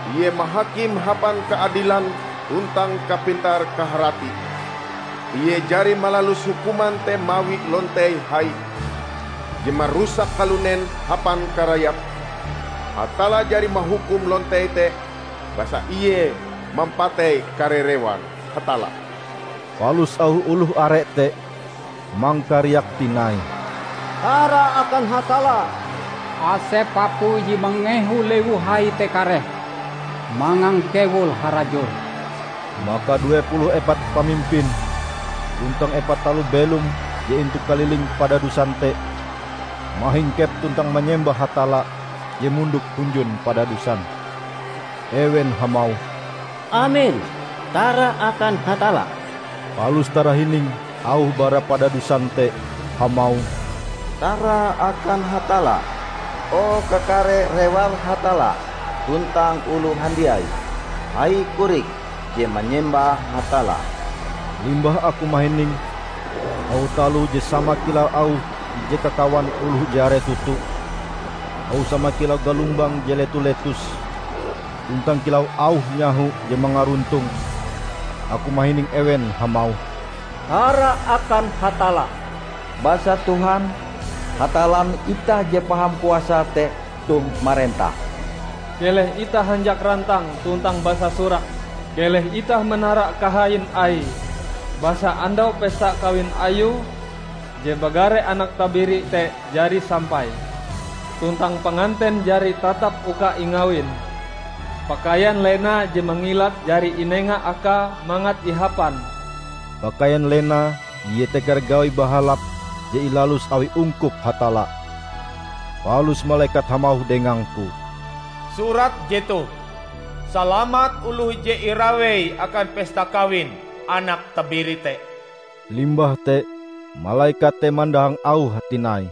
Ie mahakim hapan kaadilan tuntang kapintar-kaharati! Ie jari malalus hukuman te mawi lontei hai, je marusak kalunen hapan karayape. Hatalla jari mahukum lontei te, basa ie mampatei kare rewar Hatalla." Palus auh oloh are te mangkariak tinai, "Tara akan Hatalla! Asep apui je mangehu lewu hai te kareh mangangkewul harajur!" Maka due puluh epat pamimpin tuntang epat taloh belom je intu kaliling padadusan te mahingkep tuntang manyembah Hatalla je mondok hunjun padadusan. Ewen hamauh, "Amen! Tara akan Hatalla!" Palus tarahining auh bara padadusan te hamauh, "Tara akan Hatalla, o kakare rewar Hatalla, tuntang oloh handiai -- hai korik -- je manyembah Hatalla!" Limbah aku mahining auh taloh je sama kilau auh ije kakawan oloh je are toto, auh sama kilau galombang je letu-letus tuntang kilau auh nyaho je mangaruntong. Aku mahining ewen hamauh, "Tara akan Hatalla! Basa Tuhan, Hatallan itah je Paham Kuasae te toh marentah! Keleh itah hanjak rantang tuntang basasurak; keleh itah manara kahain Aie! Basa andau pesta kawin Ayue je bagare Anak Tabiri te jari sampai, tuntang panganten jari tatap uka ingawin. Pakaian lena je mangilat jari inenga Akae mangat ihapan." (Pakaian lena iete kare gawi bahalap je ilalus awi ungkup Hatalla.) Palus malekat hamauh dengangku, "Surat jetoh: 'Salamat oloh je irawei akan pesta kawin Anak Tabiri te.' " Limbah te malekat te mandahang auhe tinai,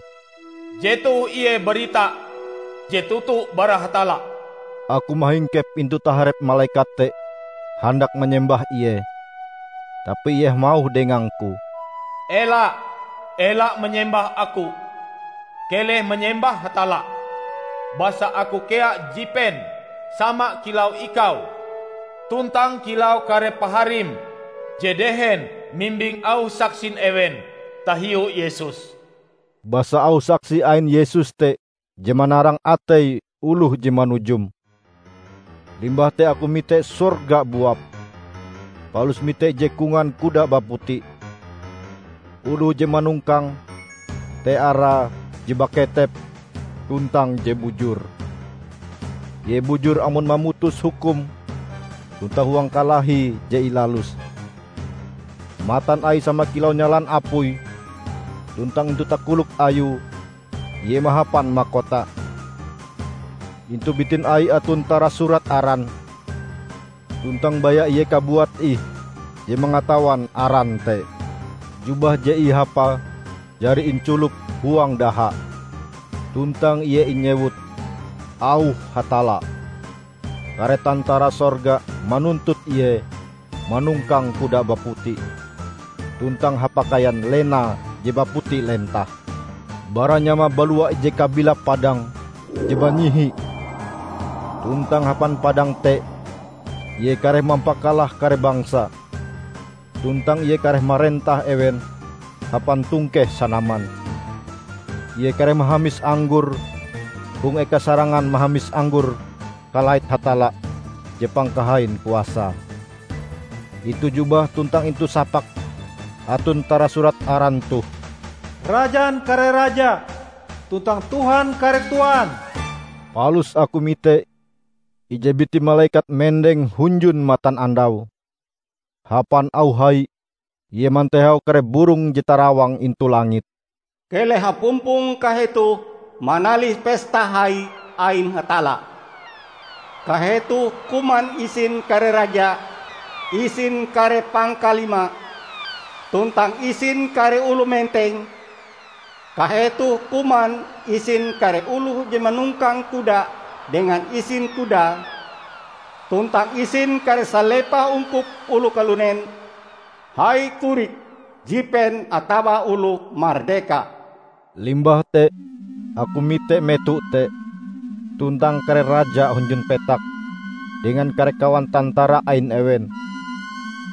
"Jetoh ie barita je toto bara Hatalla." Aku mahingkep intu taharep malekat te handak manyembah ie, tapi ie hamauh dengangku, "Ela! Ela manyembah aku, keleh manyembah Hatalla! Basa aku kea jipen sama kilau ikau tuntang kilau kare paharim je dehen mimbing auh saksin ewen tahiu Yesus!" Basa auh saksi ain Yesus te je manarang atei oloh je manujum. Limbah te aku mite sorga buap, palus mite ije kongan kuda baputi. Oloh je manongkange te arae Je Baketep tuntang Je Bujur. Ie bujur amon mamutus hukum tuntang huang kalahi je ilaluse. Matan Aie sama kilau nyalan apui tuntang intu takolok Ayue ie mahapan makota. Intu bitin Aie aton tarasurat aran; tuntang baya ie kabuat ih je mangatawan aran te. Jubah je ihapae jari inculop huang daha. Tuntang ie inyewut "Auh Hatalla". Kare tantara sorga manuntut Ie manongkang kuda baputi, tuntang hapakaian lena je baputi lentah. Bara nyamae balua ije kabilap padang je banyihi tuntang hapan padang te Ie kareh mampakalah kare bangsa, tuntang Ie kareh marentah ewen hapan tongkeh sanaman. Ie kareh mahamis anggor hong eka sarangan mahamis anggor kalait Hatalla je Pangkahain Kuasae. Intu jubahe tuntang intu sapake aton tarasurat aran toh, "Rajan kare raja, tuntang Tuhan kare tuan." Palus aku mite ije biti malekat mendeng hunjun matanandau. Hapan auh hai ie mantehau kare burong je tarawang intu langit, "Keleh hapumpong kahetoh manalih pesta hai ain Hatalla! Kahetoh kuman isin kare raja, isin kare pangkalima, tuntang isin kare oloh menteng; kahetoh kuman isin kare oloh je manongkang kuda dengan isin kudae tuntang isin kare salepah ungkup oloh kalunen, hai-korik, jipen atawa oloh mardeka!" Limbah te aku mite meto te, tuntang kare raja hunjun petak dengan kare kawan tantara ain ewen,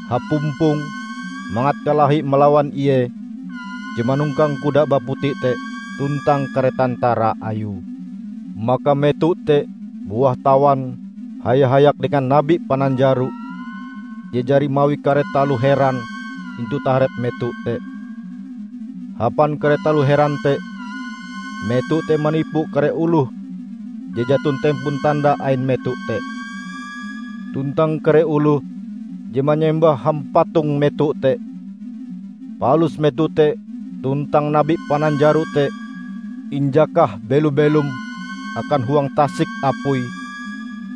hapumpong mangat kalahi malawan Ie je manongkang kuda baputi te tuntang kare tantara Ayue. Maka meto te buah tawan haya-hayak dengan nabi pananjaro je jari mawi kare taloh heran intu taharep meto te. (Hapan kare taloh heran te meto te manipu kare oloh je jaton tempon tanda ain meto te, tuntang kare oloh je manyembah hampatong meto te.) Palus meto te tuntang nabi pananjaro te injakah belo-belom akan huang tasik apui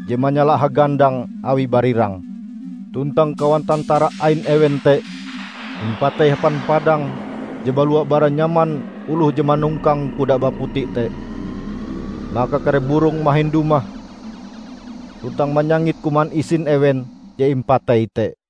je manyala hagandang awi barirang. Tuntang kawan tantara ain ewen te impatei hapan padang je balua bara nyaman oloh je manongkang kuda baputi te. Maka kare burong mahin dumah tuntang manyangit kuman isin ewen je impatei te.